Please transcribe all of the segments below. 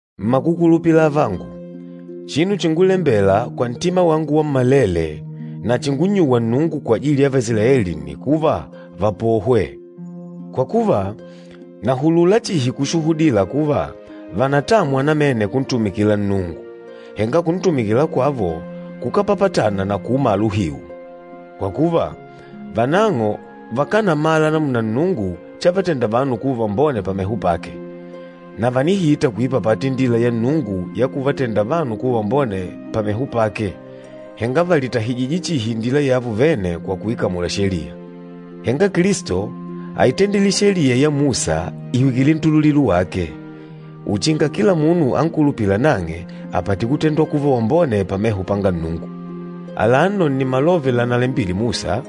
Mmakukulupila avangu, chinu chingulembela kwa ntima wangu wammalele na chingunnyuwa Nnungu kwajili ya Vaisilaeli nni kuva, vapohwe. Kwa kuva, nahulula chihi kushuhudila kuva, vànatamwa namene kuntumikila Nnungu, henga kuntumikila kwavo kukápapatana na kuumala uhiu. Kwa kuva, vanang'o vakánamala namuna Nnungu chavatenda vanu kuva vambone pameho pake, na vànihita kuipapata indila ya Nnungu ya kuvatenda vanu kuva vambone pameho pake, henga vàlitahijije chihi indila yavo vene kwa kuikamula Sheliya. Henga Kilisto áitendile Sheliya ya Musa ìhwikile ntululilo wake, uchinga kila munu ankulupîla nang'e apate kutendwa kuva wambone pameho panga Nnungu. Alano nni malove lanalembile Musa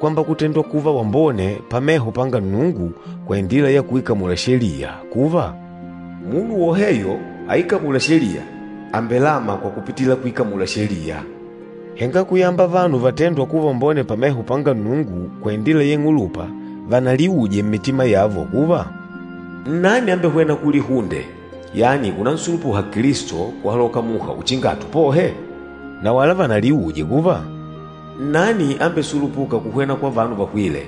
kwamba kutendwa kuva wambone pameho panga Nnungu kwa indila ya kuikamula Sheliya kuva, “Munu woheyo aikamûla Sheliya, àmbelama kwa kupitila kuikamula Sheliya.” Henga kuyamba vanu vatêndwa kuva vambone pameho panga Nnungu kwa indila ya ing'ulupa vanaliuje mmitima yavo kuva, “Nnani ambehwêna kulihunde, yani unansulupuha Kilisto kuhaloka muha uchinga atupohe?” Na wala vanaliuje kuva, “Nnani ambesulupûka kuhwena kwa vanu vahwîle,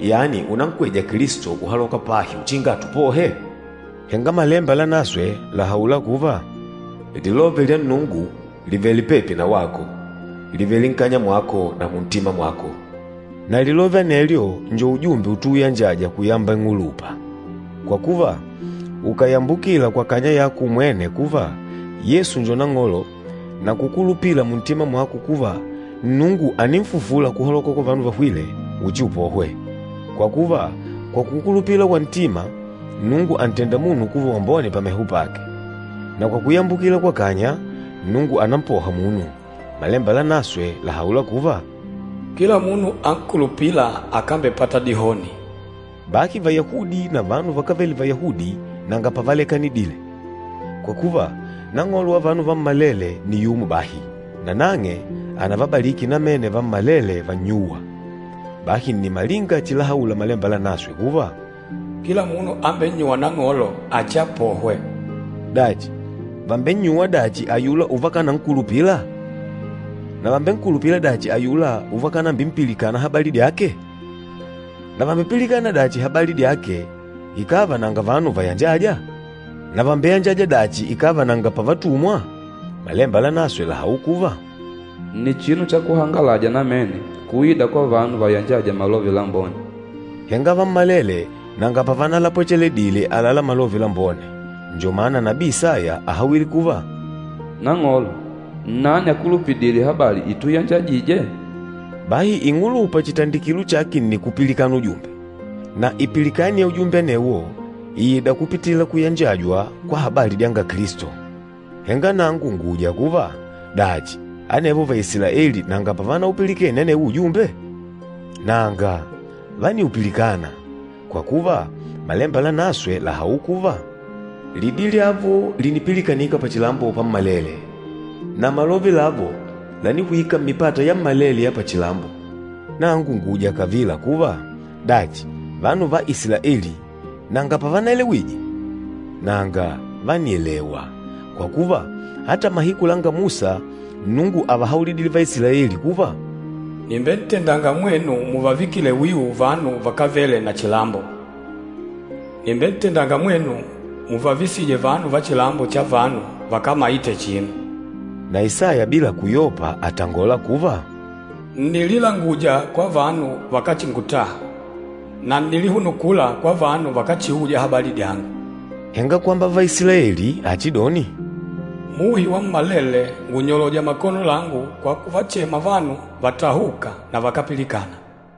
yani unankweja Kilisto kuhaloka pahi uchinga atupohe?” Henga Malemba Lanaswe làhaula kuva, “Lilove lya Nnungu lìvele pepi na wako, lìvele nkanya mwako na muntima mwako.” Na lilove anelyo njo ujumbe utuuyanjaja kuyamba ing'ulupa. Kwa kuva, ukàyambukila kwa kanya yako umwene kuva, Yesu njo Nang'olo na kukulupila muntima mwako kuva Nnungu àninfufula kuhaloka kwa vanu vahwîle, uchiupohwe. Kwa kuva, kwa kukulupila kwa ntima, Nnungu àntenda munu kuva wambone pameho pake, na kwa kuyambukila kwa kanya, Nnungu ànampoha munu. Malemba Lanaswe làhaula kuva, “Kila munu ankulupîla akambepata dihoni.” Bahi Vayahudi na vanu vakávele Vayahudi nanga pavalekanidile, kwa kuva, Nang'olo wa vanu vammalele nni yumo bahi, nanang'e ànavabaliki namene vammalele vannyûwa. Bahi nni malinga chilahaula Malemba Lanaswe kuva, “Kila munu ambennyûwa Nang'olo, achiapohwe.” Dachi, vàmbennyuwa dachi ayula uvakankulupila? Na vàmbenkulupila dachi ayula uvakanambimpilikana habali dyake? Na vàmbepilikana dachi habali dyake ikàva nanga vanu vayanjâja? Na vàmbeyanjaja dachi ikàva nanga pavatumwa? Malemba Lanaswe làhaula kuva, “Nni chinu cha kuhangalaja namene kuida kwa vanu vayanjâja Malove Lambone.” Henga vammalele nanga pavanalapwecheledile àlalá Malove Lambone. Njo mana nabii Isaya áhawile kuva, “Nang'olo, nnani akulupidîle habali ituyanjajije?” Bahi ing'ulupa chitandikilo chake nni kupilikana ujumbe, na ipilikani ya ujumbe anewo ìida kupitila kuyanjajwa kwa habali dyanga Kilisto. Henga nangu ngùuja kuva, dachi anevo Vaisilaeli nanga pavanaupilikene anewo ujumbe? Nanga, vániupilikana! Kwa kuva, Malemba Lanaswe làhaula kuva, “Lidi lyavo línipilikanika pachilambo pammalele, na malove lavo lánihwika mmipata yammalele ya pachilambo.” Nangu ngùuja kavila kuva, Dachi, vanu va Isilaeli nanga pavanaelewije? Nanga, vánielewa! Kwa kuva, ata mahiku langa Musa Nnungu ávahaulidile Vaisilaeli kuva, “Nìmbentendanga mwenu múvavikile wiu vanu vakávele na chilambo. Nìmbentendanga mwenu muvavisije vanu va chilambo cha vanu vakámaite chinu.” Na Isaya bila kuyopa àtangola kuva, “Ǹnililanguja kwa vanu vakáchingutaha, na ǹnilihunukula kwa vanu vakáchiuja habali dyangu.” Henga kwamba Vaisilaeli achidoni, “Muhi wammalele ngùnyoloja makono langu kwa kuvachema vanu vatahûka na vakápilikana.”